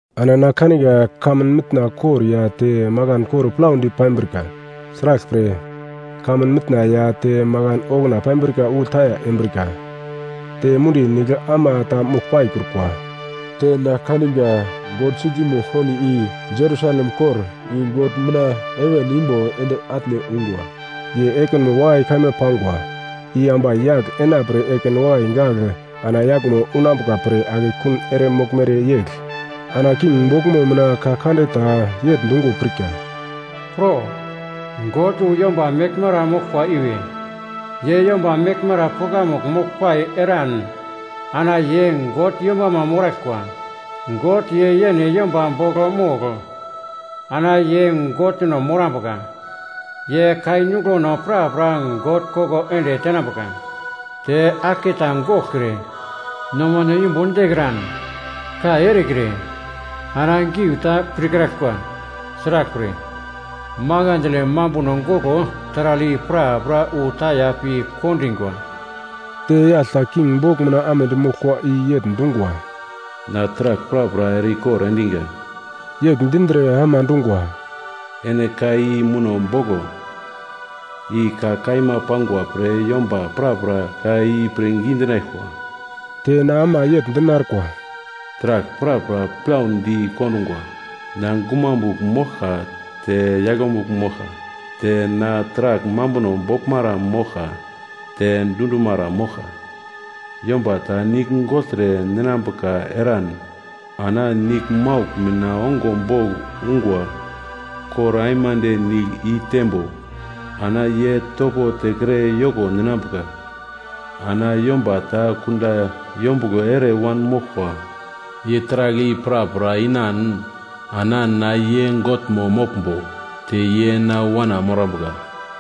Ana na kaniga kamun mitna kor ya te makan kor plaudi pambrika. Sraglpre, kamun mitna ya te makan okuna pambrika wu taya embrika. Te mundi nigl ama ta mogl paikrukwa. Te na kaniga God Sitimo Holi, i Jerusalem kor i God mina heven imbo ende atne ungwa. Ye ekinmo wakai kaima pangwa, i ambai yagl enapre ekin wakai gagl ana yaglmo unambuka pre akekun ere moglmere yegl. Ana king boglmo mina ka kande ta yegl dungo pirka, “Pro! God wu yomba meglmara moglkwa iwe. Ye yomba meglmara pukamugl moglpai eran ana ye God yombama moraglkwa. God ye yene yomba bogl mogl ana ye Godno morambuka. Ye kai nuglono prapra God koko ende tenambuka. Te aglketa goglkre, nomano yumbun dekran, kai erekre ana giu ta pirkraglkwa. Sraglpre, makandle mambuno goglo taragl i prapra wu taya pi kondingwa.” Te yagl ta king bogl mina amedi moglkwa i yegl dungwa, “Na taragl prapra ere-ikor endiga.” Yegl dindre ama dungwa, “Ene ka i muno boglo, i ka kaima pangwa pre yomba prapra ka i pirngi dinaglkwa.” Te na ama yegl dinarkwa, “Taragl prapra plaudi kondungwa. Na Gumamugl moglka te Yaglemugl moglka, te na Taragl Mambuno Boglmara moglka te Dundumara moglka. Yomba ta nigl gogltre ninambuka eran ana niglmaugl mina ongo bogl ungwa kor aimande nigl i teimbo ana ye topo tekre yoko ninambuka. Ana yomba ta kunda yombuglo ere wanmoglkwa, ye taragl i prapra inan ana na ye Godmo moglmbo te ye na wana morambuka.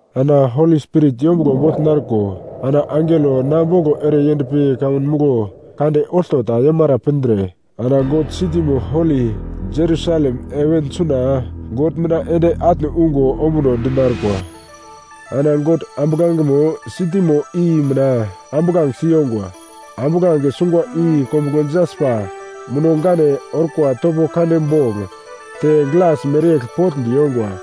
Ana Holi Spirit yombuglo bogl narko ana angelo na boglo ere yendpi kamun muglo kande olto ta yomara pindre ana God Sitimo Holi Jerusalem heven suna God mina ende atne ungo ombuno di narkwa. Ana God ambuglangemo sitimo i mina ambuglange si yongwa. Ambuglange sungwa i kombuglo jaspa muno-gane orkwa topo kande bogl te glas mereyegl potndi yongwa.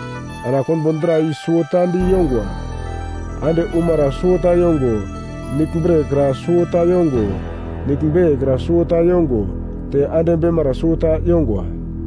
Ana konbo dra i suwota di yongwa, ande umara suwota yongo, nigl bre kra suwota yongo, nigl beiye kra suwota yongo, te ande beimara suwota yongwa.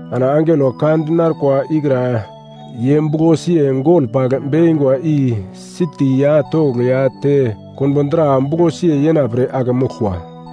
Ana angelo ka di narkwa ikra ye buglo siye gol pagl bekingwa i siti ya togl ya te konbo dra buglo siye yenapre ake moglkwa.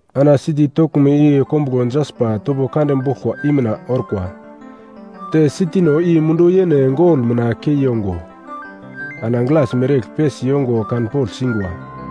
Ana siti toglmo i kombuglo jaspa topo kande boglkwa i mina orkwa, te sitino i mundu yene gol mina kei yongo, ana glas mereyegl pesi yongo kan pogl singwa.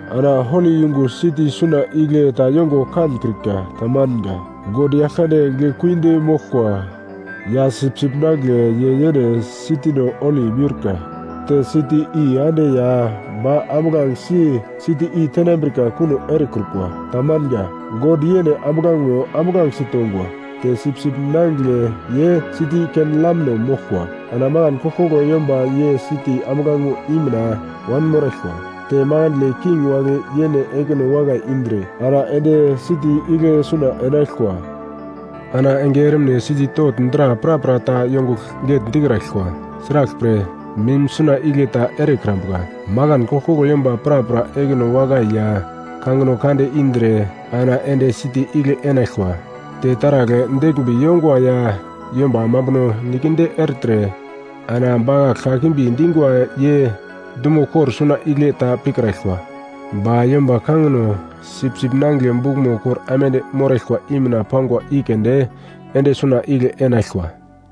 Ana holi yungu siti suna igle ta yongo kankrika. Tamanga. God Yaglkande Giglekuidi moglkwa ya Sipsip Nangigle ye yene sitino holi miurka. Te siti i ande ya ba ambuglangesi siti i tenambrika kuno erekrukwa. Tamanga. God yene ambuglangemo ambuglange sitongwa, te Sipsip Nangigle ye siti i ken lamno moglkwa. Ana makan koglkoglo yomba ye siti ambuglangemo i mina wanmoraglkwa. Te makandle king wagle yene ekino wakai indre ana ende siti igle suna enaglkwa. Ana enge ermine siti togl dra prapra ta yongugl getndikraglkwa. Sraglpre, mim suna igle ta erekrambuka. Makan koglkoglo yomba prapra ekino wakai ya kangino kande indre ana ende siti igle enaglkwa. Te taragl deglmbi yongwa ya yomba mambuno nikedi ertre ana bakagl kakimbi dingwa ye dumo kor suna igle ta pikraglkwa. Ba yomba kangino Sipsip Nangigle bukmo kor aimande moraglkwa i mina pangwa i keunde ende suna igle enaglkwa.